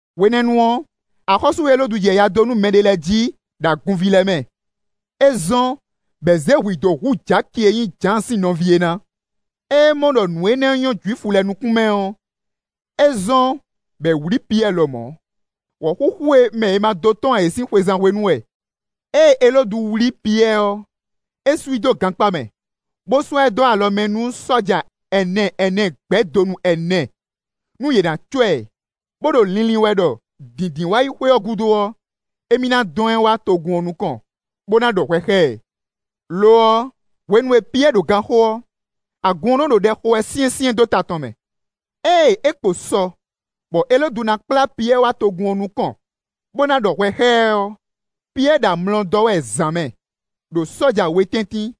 Hwenɛ́nu ɔ́, axɔ́sú Elódu jɛ ya dó nú mɛɖé lɛ́ɛ jí, ɖo agunví lɛ́ɛ mɛ. É zɔ́n bɔ è zě hwǐ dó hu Jaki e nyí Jǎan sín nɔví é ná. Ée é mɔ ɖɔ nǔ énɛ́ nyɔ́ Jwifu lɛ́ɛ nukún mɛ ɔ́, é zɔ́n, bɔ è wlǐ Piyɛ́ɛ lɔmɔ̌. (Wɔ̌xúxú e mɛ è ma dó tɔ́n ǎ é sín xwezán hwenu wɛ.) Ée Elódu wlí Piyɛ́ɛ ɔ́, é sú i dó gankpá mɛ, bó sɔ́ ɛ dó alɔ mɛ nú sɔ́ja ɛnɛ ɛnɛ gbɛ́ donu ɛnɛ, nú yě ná cɔ́ ɛ, bó ɖo linlin wɛ ɖɔ Dǐndínwáyixwe ɔ́ gúdo ɔ́, émí ná dɔn ɛ wá togun ɔ́ nukɔn, bó ná ɖɔ hwɛ xá ɛ. Lo ɔ́, hwenu e Piyɛ́ɛ ɖo ganxó ɔ́, agun ɔ́ nɔ́ ɖo ɖɛ xo wɛ syɛ́nsyɛ́n dó ta tɔn mɛ. Ée é kpo sɔ bɔ Elódu ná kplá Piyɛ́ɛ wá togun ɔ́ nukɔn, bó ná ɖɔ hwɛ xá ɛ ɔ́, Piyɛ́ɛ ɖo amlɔ dɔ́ wɛ zǎn mɛ, ɖo sɔ́ja we tɛ́ntin;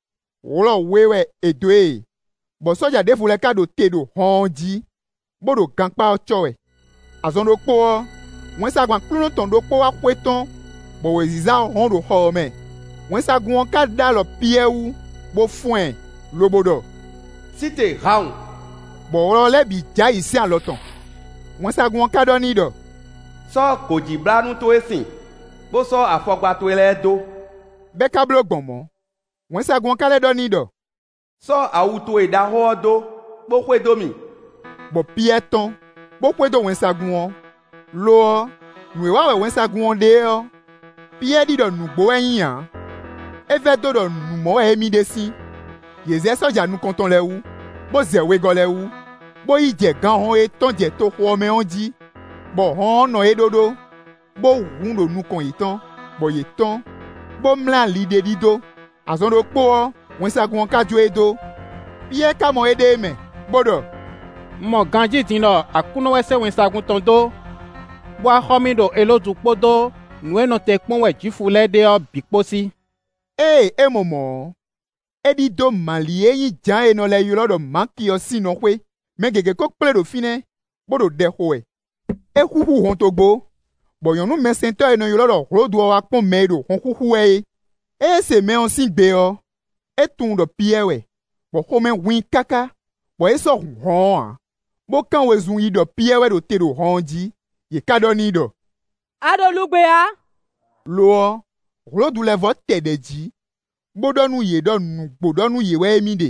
wlɔ we wɛ è dó e, bɔ sɔ́ja ɖěvo lɛ́ɛ ka ɖo te ɖo hɔn ɔ́ jí, bó ɖo gankpá ɔ́ cɔ́ wɛ. Azɔn ɖokpó ɔ́, wɛnsagun Aklúnɔ tɔn ɖokpó wá xwetɔ́n, bɔ wěziza hɔ́n ɖo xɔ ɔ́ mɛ. Wɛnsagun ɔ́ ka ɖó alɔ Piyɛ́ɛ wú, bó fɔ́n ɛ, lobo ɖɔ: “Sí te hawun!” Bɔ wlɔ lɛ́ɛ bǐ jɛ ayǐ sín alɔ tɔn. Wɛnsagun ɔ́ ka ɖɔ n'i ɖɔ: “Sɔ́ gǒjíblánú towe sin, bó sɔ́ afɔkpa towe lɛ́ɛ dó.” Bɔ é ka bló gbɔn mɔ̌. Wɛnsagun ɔ́ ka lɛ́ ɖɔ n'i ɖɔ: “Sɔ́ awu towe ɖaxó ɔ́ dó, bó xwedó mì.” Bɔ Piyɛ́ɛ tɔ́n, bó xwedó wɛnsagun ɔ́; lo ɔ́, nǔ e wa wɛ wɛnsagun ɔ́ ɖe ɔ́, Piyɛ́ɛ ɖi ɖɔ nǔgbó wɛ é nyí ǎ; é vɛdó ɖɔ nǔ mɔ wɛ émí ɖe sín. Yě zɛ sɔ́ja nukɔn tɔn lɛ́ɛ wú, bó zɛ wegɔ́ lɛ́ɛ wú, bó yi jɛ ganhɔn e tɔ́n jɛ toxo mɛ ɔ́ jí, bɔ hɔn ɔ́ nɔ é ɖóɖó, bó hun ɖo nukɔn yětɔn, bɔ yě tɔ́n, bó mlɛ́ ali ɖé ɖidó; azɔn ɖokpó ɔ́, wɛnsagun ɔ́ ka jó e dó. Piyɛ́ɛ ka mɔ éɖée mɛ, bó ɖɔ: “Un mɔ ganjí din ɖɔ Aklúnɔ wɛ sɛ́ wɛnsagun tɔn dó, bó wá xɔ mì ɖo Elódu kpódó nǔ e nɔ te kpɔ́n wɛ Jwifu lɛ́ɛ ɖe ɔ́ bǐ kpó sí.” Ée é mɔ mɔ̌ ɔ́, é ɖidó Mali e nyí Jǎan e è nɔ lɛ́ ylɔ́ ɖɔ Maki ɔ́ sín nɔ xwé. Mɛ gěgé ko kplé ɖo fínɛ́, bó ɖo ɖɛ xo wɛ. É xúxú hɔntogbó, bɔ nyɔ̌nu mɛsɛntɔ́ e è nɔ ylɔ́ ɖɔ Hlodu ɔ́ wá kpɔ́n mɛ e ɖo hɔn xúxú wɛ é. Ée é se mɛ ɔ́ sín gbe ɔ́, é tunwun ɖɔ Piyɛ́ɛ wɛ, bɔ xomɛ hun i káká, bɔ é sɔ́ hun hɔn ɔ́ ǎ, bó kán wezun yi ɖɔ Piyɛ́ɛ wɛ ɖo te ɖo hɔn ɔ́ jí. Yě ka ɖɔ n'i ɖɔ: “A ɖo lugbe ǎ.” Lo ɔ́, Hlodu lɛ́ vɔ́ tɛ ɖɛ̌ jí bó ɖɔ nú yě ɖɔ nǔgbó ɖɔ nú yě wɛ émí ɖe;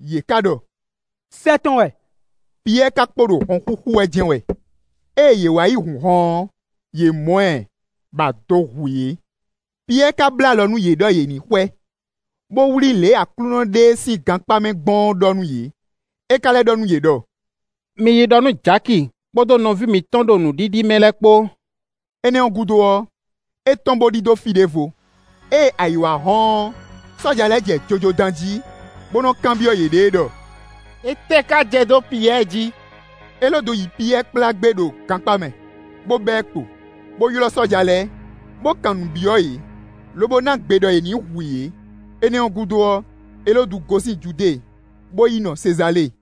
yě ka ɖɔ: “Sɛ́ tɔn wɛ.” Piyɛ́ɛ ka kpo ɖo hɔn xúxú wɛ jɛ́n wɛ; ée yě wá yi hun hɔn ɔ́, yě mɔ ɛ, bɔ ado hu yě. Piyɛ́ɛ ka bló alɔ nú yě ɖɔ yě ní xwɛ, bó wlí lě e Aklúnɔ ɖe e sín gankpá mɛ gbɔn ɔ́ ɖɔ nú yě. É ka lɛ́ ɖɔ nú yě ɖɔ: “Mi yi ɖɔ nú Jaki, kpódó nɔví mǐtɔn ɖo nǔɖiɖi mɛ lɛ́ɛ kpó.” Énɛ́ ɔ́ gúdo ɔ́, é tɔ́n bó ɖidó fí ɖěvo. Ée ayǐ wá hɔ́n ɔ́, sɔ́ja lɛ́ɛ jɛ jojo dán jí, bó nɔ́ kanbyɔ́ yěɖée ɖɔ: “Étɛ́ ka jɛ dó Piyɛ́ɛ jí?” Elódu yi Piyɛ́ɛ kplá gbé ɖo gankpá mɛ, bó ba ɛ kpo, bó ylɔ́ sɔ́ja lɛ́ɛ, bó kan nǔ byɔ́ yě, lobo ná gbe ɖɔ è nǐ hu yě. Énɛ́ ɔ́ gúdo ɔ́, Elódu gosín Judée, bó yi nɔ Sezalée.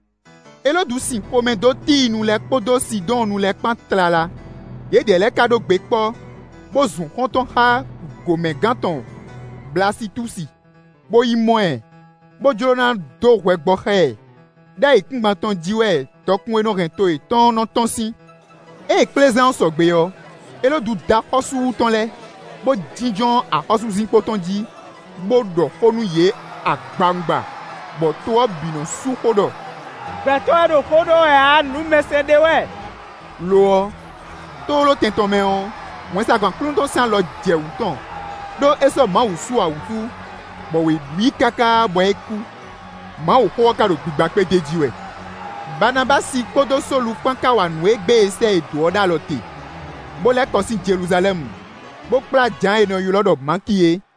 Elódu sin xomɛ dó Tíinu lɛ́ɛ kpódó Sidɔ́ɔnnu lɛ́ɛ kpán tlala. Yědɛɛ lɛ́ɛ ka ɖó gbe kpɔ́, bó zun xɔ́ntɔn xá gǒmɛgán tɔn Blasitúsi, bó yi mɔ ɛ, bó jló ná dó hwɛ gbɔ xá ɛ, ɖó ayǐkúngban tɔn jí wɛ dɔkun e nɔ hɛn to yětɔn ɔ́ nɔ́ tɔ́n sín. Ée kplézán ɔ́ sɔgbe ɔ́, Elódu dó axɔ́súwu tɔn lɛ́ɛ, bó jínjɔ́n axɔ́súzinkpo tɔn jí, bó ɖɔ xó nú yě agbawungba, bɔ to ɔ́ bǐ nɔ́ sú xó ɖɔ: “Gbɛtɔ́ wɛ ɖo xó ɖɔ wɛ ǎ; nǔmɛsɛn ɖé wɛ.” Lo ɔ́, tlóló tɛn tɔn mɛ ɔ́, wɛnsagun Aklúnɔ tɔn sín alɔ jɛ wǔ tɔn, ɖó é sɔ́ Mawu su ǎ wútu; bɔ wě ɖu i káká bɔ é kú. Mawuxó ɔ́ ká ɖo gbigba kpé d'é jí wɛ. Baanabási kpódó Sólu kpán ka wa nǔ e gbé è sɛ́ yě dó é ɖó alɔ te, bó lɛ́ kɔ sín Jeluzalɛ́mu, bó kplá Jǎan e è nɔ ylɔ́ ɖɔ Maki é.